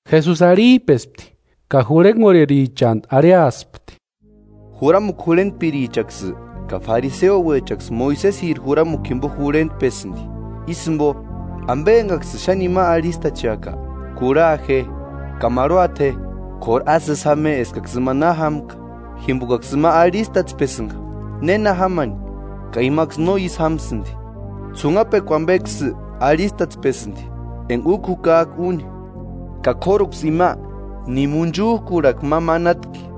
Jesusi arhip'espti ka jurhenkorherichantu arhiaspti: “Juramukua jurhentpirichaksï ka fariseuechaksï Moisesiri juramukua jimpo jurhentpesïnti. Ísï jimpo, ampe enkaksïni xáni ima arhistacheaka, kurha je ka marhuata je; k'óru ásï ísï jáma je eskaksï ima na jámka, jimpokaksï ima arhistatspesïnka néna jámani ka imaksï no ísï jámasïnti. Ts'unhapekua ampeksï arhistatspesïnti enka úkua jukak'a úni, ka k'óruksï ima, ni munchuk'urhakua ma manatki.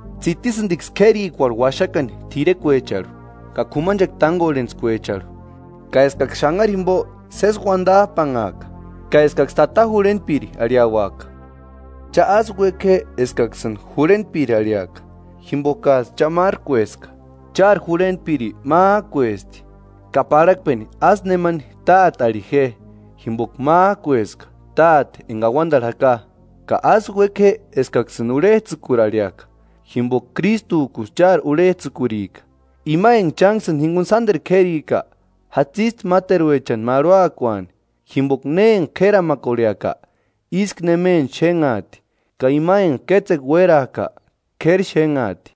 tsitisïntiksï k'érikuarhu uaxakani t'irekuecharhu ka k'umanchekua tánkorhentskuecharhu. Ka eskaksï xanhari jimpo sési uantap'anhaaka, ka eskaksï: Tata jurhentpiri, arhiauaka.” “Cha ásï uéka je eskaksïni: Jurhentpiri, arhiaka, jimpokats'ï cha márkueska, chári jurhentpiri mák'uesti. Ka parhakpeni ásï nemani: Tate, arhi je; jimpoka mák'ueska Táte enka auantarhu jaka. Ka ásï uéke je eskaksïni: Urhets'ïkuri, arhiaka. Jimpoka Krístuk'usï chári urhets'ïkurika. Ima enka chánksïni jinkuni sánteru k'érika, jatsisti máteruechani marhuakuani. Jimpoka ne enka k'éramakorheaka, ísku nemeni xénhaati, ka ima enka kétsekua uérak'a, k'éri xénhaati.”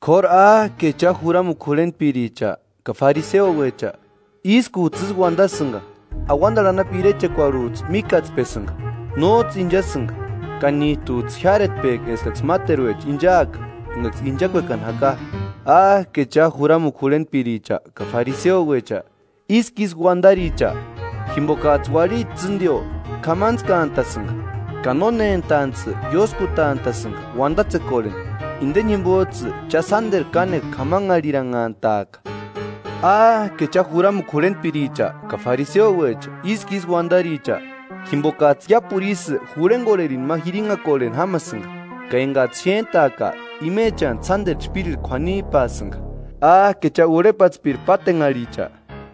“K'óru ¡Áke cha, juramukua jurhentpiricha ka fariseuecha, ískuts'ï ísï uantasïnka! Auantarhu anapu irechekuarhuts'ï míkatspesïnka, nóts'ï inchasïnka ka nít'uts'ï jiáretpek'i eskaksï máteruecha inchaaka, enkaksï inchakuekani jaka. ¡Áke cha, juramukua jurhentpiricha ka fariseuecha ísku ísï uantaricha! ¡Jimpokats'ï uarhiti tsîntio k'amantskantasïnka, ka nónentantsï ióskutant'a'sïnka uantatsekorheni, inte jimpots'ï cha sánteru kánekua k'amanharhiranhantaaka!” “¡Áke cha, juramukua jurhentpiricha ka fariseuecha, ísku ísï uantaricha! Jimpokats'ï iápuru isï jurhenkorherini ma jirinhakorheni jámasïnka, ka enkaksï xéntak'a imechantsï sánteru chpírirhu k'uanip'asïnka.” “¡Áke cha, urhepatspiri pátenharhicha!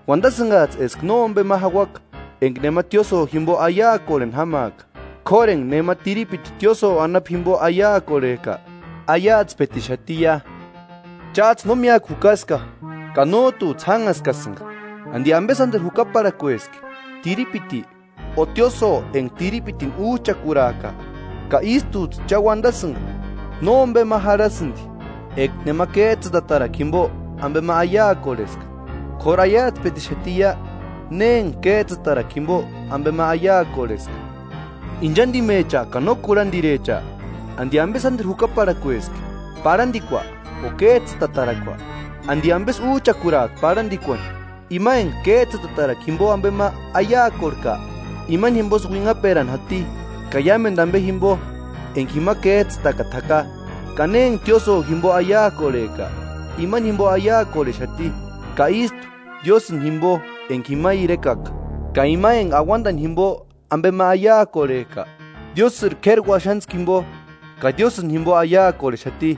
Uantasïnkats'ï eska nómpe ma jauaka eka nema tiósïo jimpo aiakorheni jámaaka, k'óru enka nema tiripiti tiósïo anapu jimpo aiakorhek'a, aiatspetixatiia. ¡Cháts'ï no míakua jukaska ka nót'uts'ï jánhaskasïnka! ¿Anti ampe sánteru jukaparhakueski? ¿Tiripiti, o tiósïo enka tiripitini uch'akuraak'a? Ka ístuts'ï cha uantasïnka: ‘Nómpema jarhasïnti eka nema kéts'ïtatarakua jimpo ampe aiakorheska, k'óru aiatspetixatiia, ne enka kéts'ïtakua jimpo ampe aiakorheska.’ ¡Inchantimecha ka no kurhantirecha! ¿Anti ampe sánteru jukaparhakueski, parhantikua o kéts'ïtatarakua? ¿Anti ampesï úch'akurak'i parhantikuani? Ima enka kéts'ïtatarakuani jimpo ampe aiakorhek'a, imani jimposï uinhaperani jati, ka iámentu ampe jimpo enka jima kéts'ïtakata jaka. Ka ne enka tiósïo jimpo aiakorhek'a, imani jimpo aiakorhexati, ka ístu Diósïni jimpo enka jima irekaka; ka ima enka auantani jimpo ampe aiakorhek'a, Diósïri k'éri uaxantskua jimpo, ka Diósïni jimpo aiakorhexati.”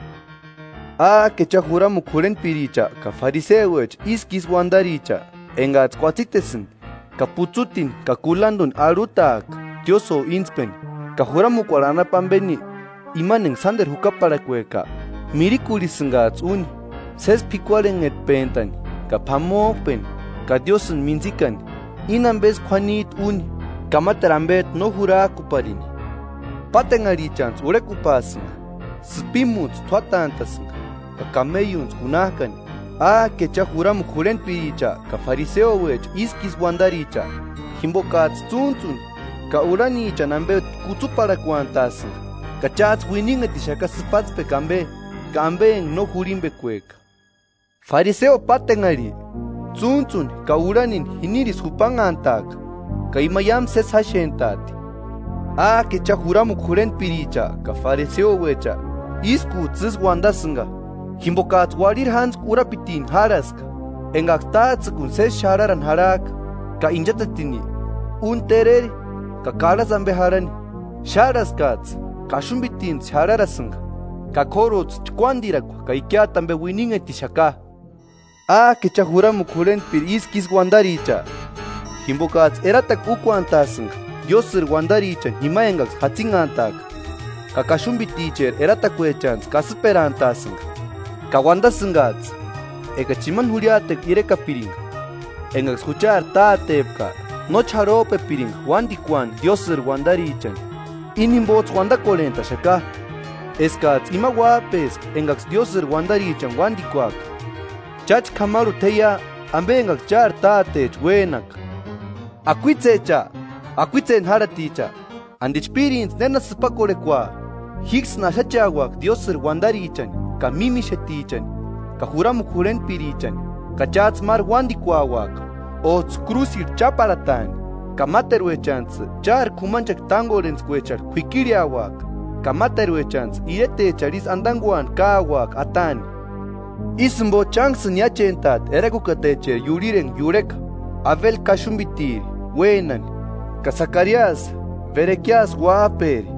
“¡Áke cha, juramukua jurhentpiricha ka fariseuecha ísku ísï uantaricha! Enkats'ï kuatsitesïni ka putsutini ka kulantuni arhutak'a tiósïo íntspeni. Ka juramukuarhu anapu ampeni, imani enka sánteru jukaparhakueka mirikurhisïnkats'ï úni: Sési p'ikuarhenhetpentani ka p'amop'eni ka Diósïni mintsikani. Íni ampesï k'uanit'i úni ka máteru ampet'u no jurak'uaparini. ¡Pátenharhichantsï urhekupaasïnka, sïpimuntsï t'úatant'a'sïnka ka kameiuntsï kunak'ani!” “¡Áke cha, juramukua jurhentpiricha ka fariseuecha ísku ísï uantaricha! Jimpokats'ï tsúntsuni ka urhanichani ampe kutsuparhakuantasïnka, ka cháts'ï uininhetixaka sïpatspekua ampe, ka ampe enka no jurhimpekueka. ¡Fariseo pátenharhi, tsúntsuni ka urhanini jinirisï jupanhantaaka ka iámu sési jáxent'aati!” “¡Áke cha, juramukua jurhentpiricha ka fariseuecha ískuts'ï ísï uantasïnka! Jimpokats'ï uarhiri jántskua urapitini járhaska, enkaksï táts'ïkuni sési xarharani jarhak'a, ka inchatsetini úni tereri ka karhasï ampe jarhani. Xárhaskats'ï: Kaxumpitintsï xarharasïnka, ka k'óruts'ï chkuántirakua ka ikiata ampe uininhetixaka.” “¡Áke cha, juramukua jurhentpiricha ísku ísï uantaricha! Jimpokats'ï eratakua úkuantasïnka Diósïri uantarichani jima enkaksï jatsinhantka, ka kaxumpiticheri eratakuechantsï kasïperantaasïnka, ka uantasïnkats'ï: ‘Ekachi imani jurhiatekua irekapirinka enkaksï juchari tátepka, nóchi jarhop'epirinka uántikuani Diósïri uantarichani.’ Íni jimpots'ï uantakorhent'axaka eskats'ï ima uáp'eska enkaksï Diósïri uantarichani uántikuaka. ¡Cháchka k'amarhuta jeia, ampe enkaksï chári tátecha uénaka! ¡Akuitsecha, akuitseni járhaticha! ¿Anti chpírintsï néna sïpakorhekua?” “Jíksïni axacheauaka Diósïri uantarichani ka mímixetichani ka juramukua jurhentpirichani, ka cháts'ï máru uántikuauaka, óts'ï krúsirhu cháparhataani, ka máteruechantsï chári k'umanchekua tánkorhentskuecharhu k'uikirheauaka, ka máteruechantsï iretecharhu isï antankuani káuaka ataani. Ísï jimpo, chánksïni niáchent'aati erakukatecheri iurhiri enka iurheka, Abeli kaxumpitiri uénani ka Sakariasi Berekiasi uáp'eri,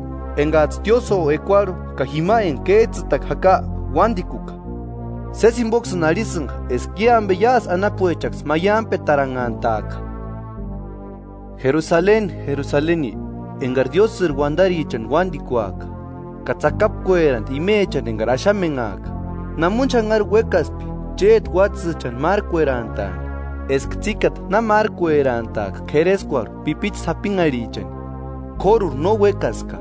enkats'ï tiósïo ekuarhu ka jima enka kéts'ïtakua jaka uántikuka. Sési jimpoksïni arhisïnka eska i ampe iásï anapuechaksï maiampetaranhantaaka.” “¡Jerusaleni, Jerusaleni enkari Diósïri uantarichani uántikuak'a ka tsakapkueraanti imechani enkari axamenhak'a! Namoni xanhari uékaspki chéti uátsïchani márkuerantaani, eska tsíkata na márkuerantaaka kereskuarhu pipichu sapinharhichani, k'óruri no uékaska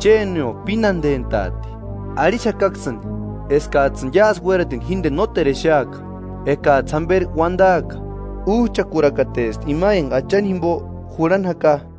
Chénio pínantentaati. Arhixakaksïni ekats'ïni iásï uératini jínteni nóteru exeaka ekats'ï jamperi uantaaka: ‘Úch'akurakatesti ima enka Achani jimpo jurhani jaka.’”